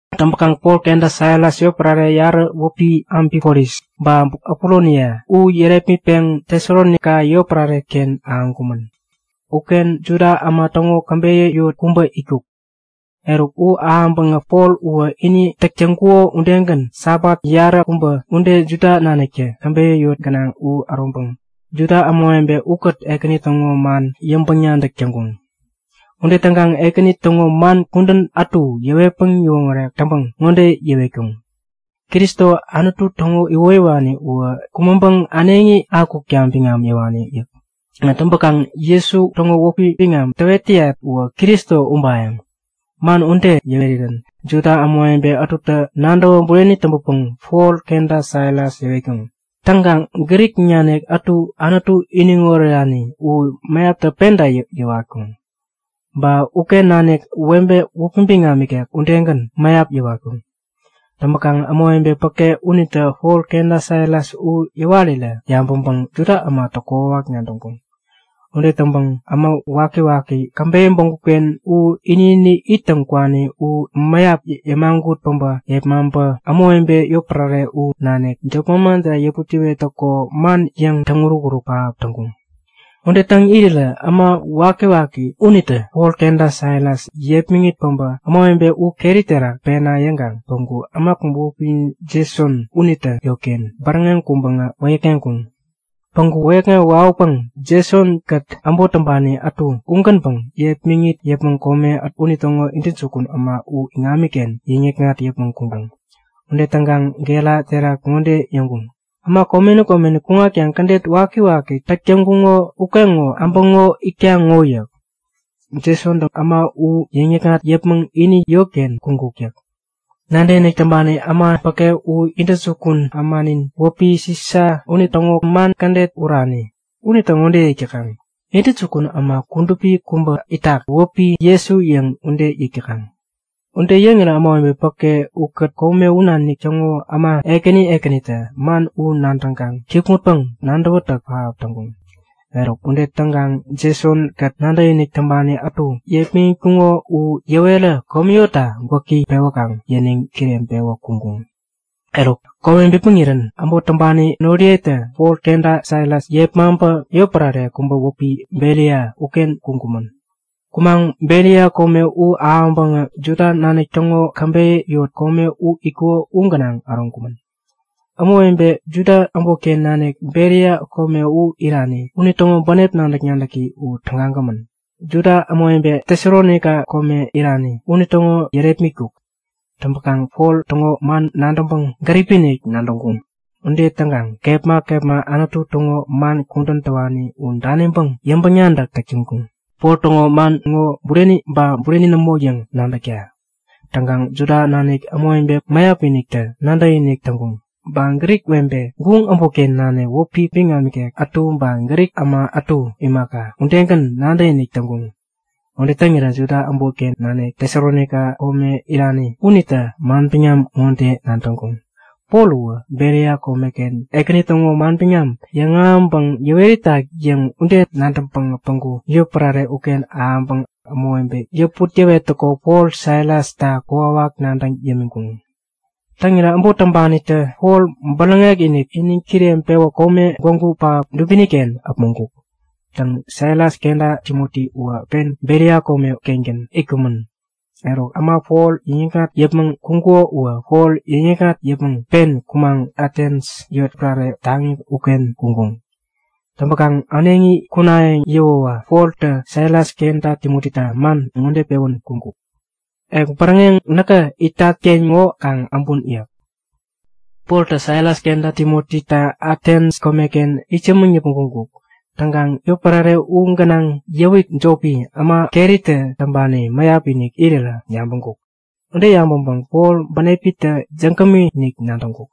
Täŋpäkaŋ Pol kenta Silas yotpärare yarä wäpi Amfipolis ba Apolonia u yärepmitpeŋ Tesalonaika yotpärare-ken ahäŋkumän.Uken Juda äma täŋo käbeyä yot kubä itkuk. Eruk, u ahäŋpäŋä Pol uwä ini täk täŋkuko udegän Sabat yaräkubä ude Juda naniktä käbeyä yot gänaŋ u äroŋpäŋ Juda ämawebe ukät Ekäni täŋo man yäŋpäŋ-nadäk täŋkuŋ. Ude täŋkaŋ Ekäni täŋo man kudän ätu yäwetpäŋ yäwoŋärek täŋpäŋ ŋode yäwetkuk; Kristo, Anutu täŋo iwoyäwani uwä kumäŋpäŋ äneŋi akukta biŋam yäwani yäk. Täŋpäkaŋ Jesu täŋo wäpi biŋam täwet täyat uwä Kristo ubayäŋ. Man ude yäwerirän Juda ämawebe ätutä nadäwä bureni täŋpäpäŋ Pol kenta Silas yäwatkuŋ. Täŋkaŋ Grik nanik ätu Anutu iniŋ orerani u mäyaptä penta yäwatkuŋ. Ba uken nanik webe wäpi biŋam ikek udegän, mäyap yäwatkuŋ. Täŋpäkaŋ ämawebe päke unitä Pol kenta Silas u yäwarä yabäŋpäŋ Juda ämatä kokwawak nadäŋkuŋ. Ude täŋpäŋ äma wakiwaki käbeyä bägup-ken u ini-ini ittäŋ kwani u mäyap yämagut päbä yepmaŋpä ämawebe yotpärare u nanik jop manman terak yäput-yäwettäko man yäŋ täŋuruk-uruk pähap täŋkuŋ. Ude täŋ irirä äma wakiwaki unitä Pol kenta Silas yepmäŋit päbä ämawebe u keri terak pena yäŋkaŋ päŋku äma kubä wäpi Jeson unitä yotken bäräŋeŋ kuŋpäŋä wäyäkŋeŋkuŋ. Päŋku wäyäkŋewä wawäpäŋ Jeson-kät äbot täŋpani ätu ugänpäŋ yepmäŋit yäpmäŋ kome unitäŋo intäjukun äma u iŋamiken yäŋ-yäkŋat yäpmäŋ kuŋkuŋ. Ude täŋkaŋ gera terak ŋode yäŋkuŋ; Äma komeni komeni kuŋatkaŋ kädet wakiwaki täk täŋkuŋo ukeŋo äbäŋo itkaŋ ŋo yäk. Jesontä äma u yäŋ-yäkŋat yäpmäŋ ini yotken kuŋkuk yäk. Nadäkinik täŋpani äma päke u intäjukun ämanin wäpi Sisa unitäŋo man kädet urani. Unitä ŋode yäk täkaŋ; Intäjukun äma kudupi kubä itak, u wäpi Jesu yäŋ ude yäk täkaŋ. Ude yäŋirä ämawebe päke ukät kome u nanik täŋo äma ekäni ekänitä man u nadäŋkaŋ kikŋutpäŋ-nadäwätäk pähap täŋkuŋ. Eruk ude täŋkaŋ Jeson-kät nadäkinik täŋpani ätu yepmäŋitkuŋo u yäwerä komi yotta gwäki pewäkaŋ yäniŋ kireŋpewä kuŋkuŋ. Eruk, kome bipmäŋirän, äbot täŋpani noriyetä Pol kenta Silas yepmaŋpä yotpärare kubä wäpi Beria uken kuŋkumän. Kumaŋ Beria kome u ahäŋpäŋä Juda nanik täŋo käbeyä yot kome u itkuko u gänaŋ äroŋkumän. Ämawebe Juda äbotken nanik Beria kome u irani unitäŋo bänep nadäk-nadäki u tägagämän, Juda ämawebe Tesalonaika kome irani unitäŋo yärepmitkuk. Täŋpäkaŋ Pol täŋo man nadäŋpäŋ gäripi-inik nadäŋkuŋ. Ude täŋkaŋ kepma kepma Anutu täŋo man kudän täwani u daniŋpäŋ yäŋpäŋ-nadäk täk täŋkuŋ, Pol täŋo man ŋo bureni ba bureni nämo yäŋ nadäkta. Täŋkaŋ Juda nanik ämawebe mäyap-iniktä nadäkinik täŋkuŋ. Ba Grik webe, guŋ äbotken nanik wäpi biŋam ikek ätu, ba Grik äma ätu imaka, udegän nadäkinik täŋkuŋ. Ude täŋirä Juda äbotken nanik Tesalonaika kome irani unitä manbiŋam ŋode nadäŋkuŋ; Pol uwä Beria komeken Ekäni täŋo manbiŋam yäŋahäŋpäŋ yäwet itak yäŋ ude nadäŋpäŋä päŋku yotpärare uken ahäŋpäŋ ämawebe yäput-yäwettäko Pol Silasta kokwawak nadäŋ yämiŋkuŋ. Täŋirä äbot täŋpanitä Pol bäräŋek-inik iniŋ kireŋpewä kome, gwägu pähap dubini-ken äpmoŋkuk. Täŋ, Silas kenta Timoti uwä pen Beria kome-kengän itkumän. Eruk äma Pol yäŋikŋat yäpmäŋ kuŋkuŋo uwä Pol yäŋikŋat yäpmäŋ pen kumaŋ Atens yotpärare taŋi uken kuŋkuŋ. Täŋpäkaŋ äneŋi kunayäŋ yäwäwä Poltä Silas kenta Timotita man ŋode pewän kuŋkuk; Ek bäräŋeŋ näkä itat-ken ŋo kaŋ äbun yäk. Poltä Silas kenta Timotita Atens komeken itsämäŋ yäpmäŋ kuŋkuk. Täŋkaŋ yotpärare u gänaŋ yäwik jopi, äma keritä täŋpani mäyap-inik irirä yabäŋkuk. Ude yabäŋpäŋ Pol bänepitä jägämi-inik nadäŋkuk.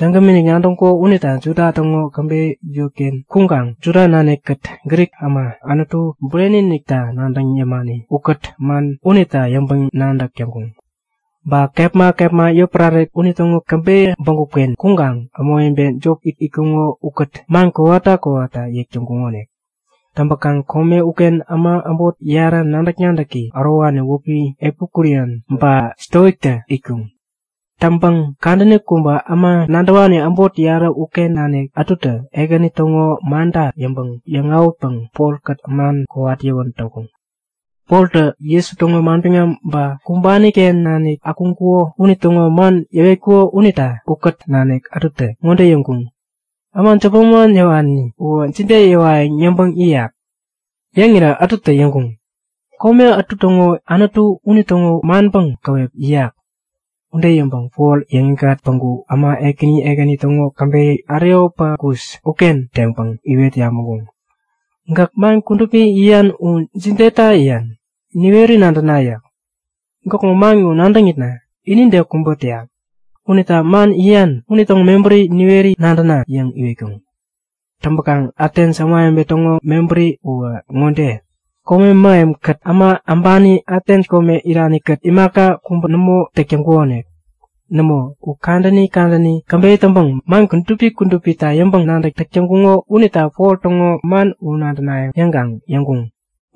Jägämi nadäŋkuko unita Juda täŋo käbeyä yotken kuŋkaŋ Juda nanikkät Grik äma Anutu burenita nadäŋ imani ukät man unita yäŋpäŋ-nadäk täŋkuŋ. Ba kepma kepma yotpärare unitäŋo käbeyä bägup-ken kuŋkaŋ ämawebe jop itkuŋo ukät man kowata kowata yäk täŋkuŋonik. Täŋpäkaŋ kome uken äma äbot yarä nadäk-nadäki ärowani wäpi Epikurian ba Stoiktä itkuŋ. Täŋpäŋ kadäni kubä äma nadäwani äbot yarä uken nanik ätutä Ekäni täŋo manta yäŋpäŋ yäŋ-awätpäŋ Polkät man kowat yäwän täŋkuŋ. Poltä Jesu täŋo manbiŋam ba kumbani-ken nanik akuŋkuko unitäŋo man yäwetkuko unita ukät nanik ätutä ŋode yäŋkuŋ; Äma jop manman yäwani uwä jide yäwayäŋ yäŋpäŋ yäyak? Yäŋirä ätutä yäŋkuŋ; Kome ätu täŋo anutu unitäŋo manpäŋ käwep yäyak. Ude yäŋpäŋ Pol yäŋikŋat päŋku äma ekäni ekäni täŋo käbeyä wäpi Areopagus uken teŋpäŋ iwet yabäŋkuŋ; Gäk man kudupi yäyan u jideta yäyan? Niweri nadäna yäk. Gäkŋo man ŋo nadäŋitna inide kubä täyak unita man yäyan unitäŋo mebäri niweri nadäna! yäŋ iwetkuŋ. Täŋpäkaŋ Atens ämawebe täŋo mebäri uwä ŋode; Kome mähemkät äma äbani Atens kome irani-kät imaka kubä nämo täk täŋkuŋonik. Nämo, u kadäni kadäni käbeyä täŋpäŋ man kudupi kudupita yäŋpäŋ-nadäk täk täŋkuŋo unita Pol täŋo man u nadänayäŋ yäŋkaŋ yäŋkuŋ.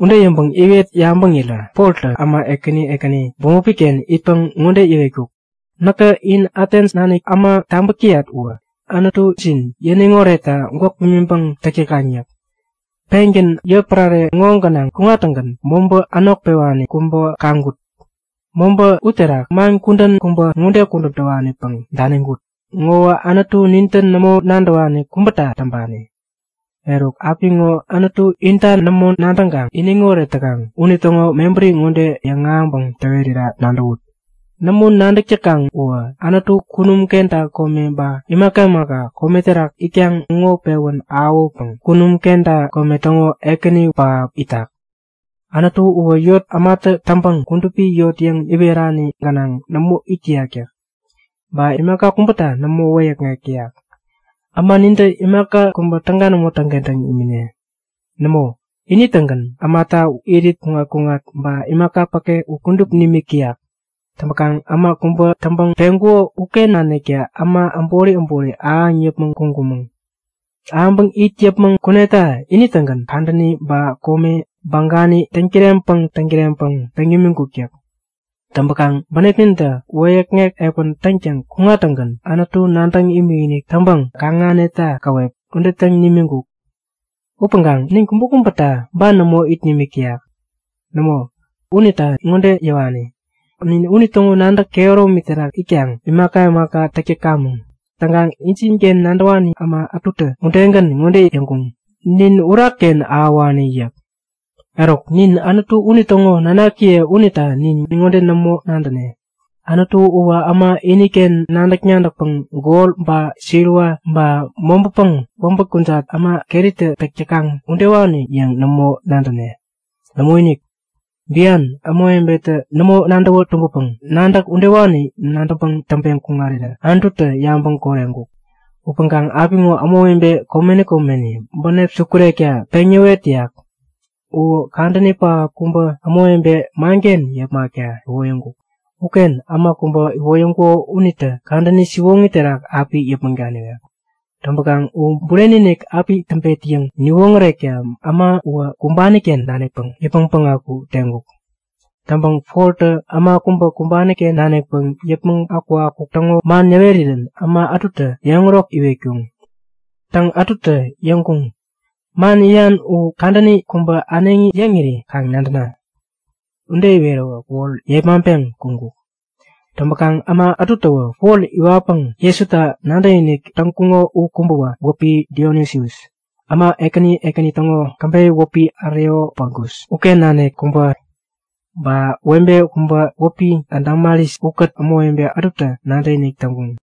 Ude yäŋpäŋ iwet yabäŋirä Poltä äma ekäni ekäni bämopi-ken itpäŋ ŋode yäwetkuk; Näkä in Atens nanik äma tabäk täyat uwä anutujin yäniŋ oretta gwäk pimiŋpäŋ täk täkaŋ yäk. Pengän yotpärare ŋo gänaŋ kuŋattäŋgän mobä änok pewani kubä kaŋkut. Mobä uterak man kudän kubä ŋode kudän täwanipäŋ daniŋkut; Ŋowä anutu nintä nämo nadäwani kubäta täŋpani. Eruk, apiŋo Anutu intä nämo nadäŋkaŋ iniŋoret täkaŋ unitäŋo mebäri ŋode yäŋahäŋpäŋ täwera nadäwut; Nämo nadäk täkaŋ uwä Anutu kunum kenta kome ba imaka imaka kome terak itkaŋ ŋo pewän ahäwäpäŋ kunum kenta kome täŋo Ekäni pähap itak. Anutu uwä yot ämatä täŋpäŋ kudupi yot yäŋ iwerani gänaŋ nämo it täyak yäk. Ba imaka kubäta nämo wäyäkŋek täyak. Äma nintä imaka kubä täga nämo täŋkentäŋ imine. Nämo, ini-tägän ämata irit-kuŋat-kuŋat ba imaka päke u kudup nimik täyak. Täŋpäkaŋ äma kubä täŋpäŋ peŋkuko uken naniktä äma äbori äbori ahäŋ yäpmäŋ kuŋkumäŋ. Ahäŋpäŋ it yäpmäŋ kuneta ini-tägän kadäni ba kome bagani täŋkireŋpäŋ täŋkireŋpäŋ peŋ nimiŋkuk yäk. Täŋpäkaŋ bänepnintä wäyäkŋek epän täŋtäŋ kuŋtäŋgän Anutu nadäŋ imikinik täŋpäŋ kaŋ-ahäneta käwep, ude täŋ nimiŋkuk. Upäŋkaŋ nin kubäkubäta ban nämo it nimik täyak. Nämo, unita ŋode yäwani; Nin unitäŋo nadäk kehäromi terak itkaŋ imaka imaka täk täkamäŋ. Täŋkaŋ injinken nadäwani äma ätutä udegän ŋode yäŋkuŋ; Nin urakken ahäwani yäk. Eruk, nin Anutu unitäŋo nanakiye unita nin ŋode nämo nadäne; Anutu uwä äma iniken nadäk-nadäkpäŋ gol ba siliwa, ba mobäpäŋ wäbät kujat äma keritä täk täkaŋ udewani yäŋ nämo nadäne. Nämoinik! Bian ämawebetä nämo nadäwä tumbäpäŋ nadäk udewani nadäŋpäŋ täŋpeŋ kuŋarirä Anututä yabäŋ koreŋkuk. Upäŋkaŋ apiŋo ämawebe komeni komeni bänep sukurekta peŋ yäwet täyak. U kadäni pähap kubä ämawebe manken yepmakta iwoyäŋkuk. Uken äma kubä iwoyäŋkuko unitä kudän siwoŋi terak api yäpmäŋ daniwek. Täŋpäkaŋ u bureni-inik api täŋpet yäŋ niwoŋärekta äma uwä kumbani-ken nanikpäŋ yäpmäŋ päŋaku teŋkuk. Täŋpäŋ Poltä äma kubä kumbani-ken nanikpäŋ yäpmäŋ akukakuk täŋo man yäwerirän äma ätutä yäŋärok iwetkuŋ. Täŋ, ätutä yäŋkuŋ; Man yäyan u kadäni kubä äneŋi yäŋiri kaŋ nadäna! Ude iwerirä Pol yepmaŋpeŋ kuŋkuk. Täŋpäkaŋ äma ätutäwä Pol iwatpäŋ Jesuta nadäkinik täŋkuŋo u kubäwä wäpi Dionisius, äma ekäni ekäni täŋo käbeyä wäpi Areopagus uken nanik kubä. Ba webe kubä wäpi Damaris ukät ämawebe ätutä nadäkinik täŋkuŋ.